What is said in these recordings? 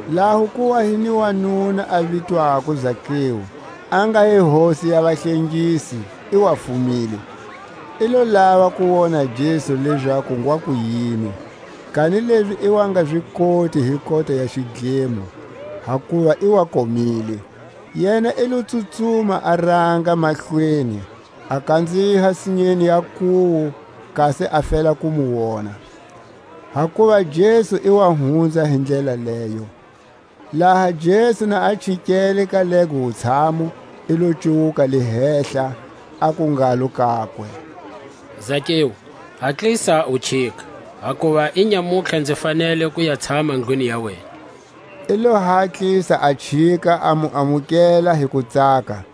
Laho ku wa hi ni wanuna a vitwako Zakeu, a nga hi hosi ya vahlengisi; i wa fumile. I lo lava ku wona Jesu lezaku ngwa kuyini; kanilezi i wa nga zi koti hi kota ya xidlemo, hakuva i wa komile. Yena i lo tsutsuma a ranga mahlweni, a kanziha sinyeni ya nkuwu, kasi a fela ku mu wona; hakuva Jesu i wa hunza hi ndlela leyo. Laha Jesu na a chikele ka lego wutshamu, i lo cuwuka le hehla, aku ngalo kakwe: Zakeu, hatlisa u chika; hakuva inyamutlha nzi fanele ku ya tshama ndlwini ya wena. I lo hatlisa a chika, a mu amukela hi kutsaka.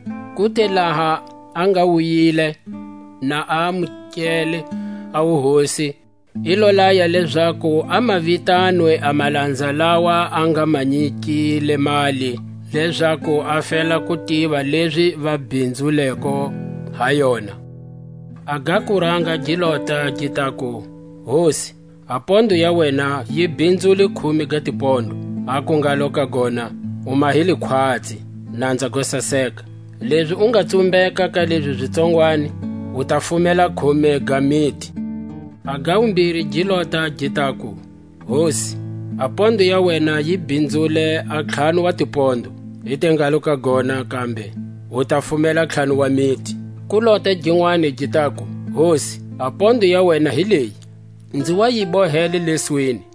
Ku te laha a nga wuyile, na a amukele a wuhosi, i lo laya lezaku a ma vitanwe a malanza lawa a nga ma nyikile mali, lezaku a fela ku tiva lezi va bhinzuleko ha yona. A ga kuranga gi lota, gi taku: Hosi, a pondo ya wena yi bhinzule khume ga tipondo. Aku ngalo ka gona: U mahile khwatsi, nanza go saseka; lezi u nga tsumbeka ka lezi zi tsongwani, u ta fumela khume ga miti. A ga wumbiri gi lota, gi taku: Hosi, a pondo ya wena yi bhinzule a ntlhanu wa tipondo. I te ngalo ka gona kambe: U ta fumela ntlhanu wa miti. Ku lota ginwani gi taku: Hosi, a pondo ya wena hi leyi; nzi wa yi bohele leswini,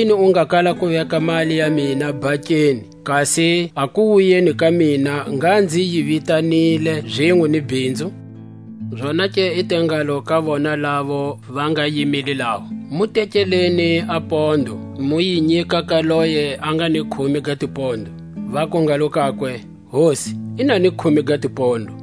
Hikuyini u nga kala ku veka mali ya mina bankeni, kasi a kuwuyeni ka mina ngha nzi yi vitanile zinwe ni bhinzu? Zonake i te ngalo ka vona lavo va nga yimile laho: Mu tekeleni a pondo, mu yi nyika ka loye a nga ni khume ga tipondo. Vaku ngalo kakwe: Hosi, i na ni khume ga tipondo.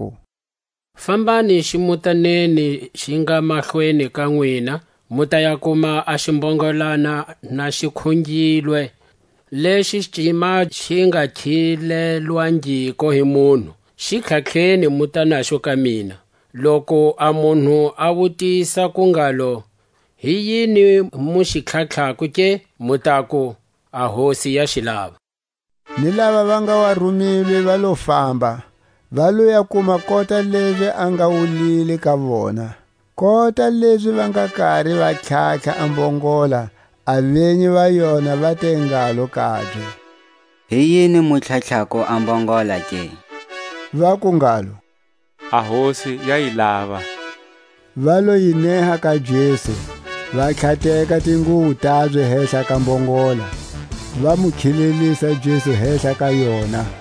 aku: Fambani ximutaneni xi nga mahlweni ka nwina, mu ta ya kuma a ximbongolana na xi khungilwe, lexi cima xi nga khilelwangiko hi munhu; xi tlhatlheni muta naxo ka mina. Loku a munhu a wutisa ku ngalo: Hi yini mu xi tlhatlhako ke? mu taku: A Hosi ya xi lava. Ni lava va nga wa rumilwe va lo famba, va lo ya kuma kota lezi a nga wulile ka vona. Kota lezi va nga kari va tlhatlha a mbongola, a venyi va yona va te ngalo kabye: Hi yini mu tlhatlhako a mbongola ke? Vaku ngalo: A Hosi ya yi lava. Va lo yi neha ka Jesu, va tlhateka tinguwo tabye hehla ka mbongola, va mu khilelisa Jesu hehla ka yona.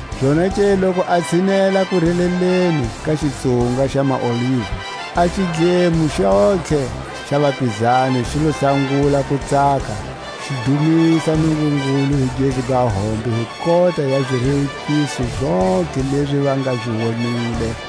Zonake loku a tshinela kureleleni ka xitsunga xa maOliva, a xidlemo xontlhe xa vapizani xi lo sangula ku tsaka, xi dumisa Nungungulu hi gezu ga hombe hi kota ya zirewukiso zontlhe lezi va nga zi wonile;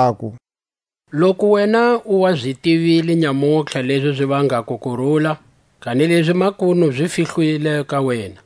aku: Loku wena u wa zi tivile nyamutlha lezi zi vangako kurula! Kanilezi makunu zi fihlilwe ka wena.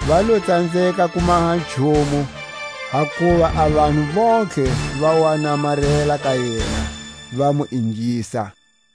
Va lo tsanzeka ku maha nchumu, hakuva a vanhu vontlhe va wa namarela ka yena, va mu ingisa.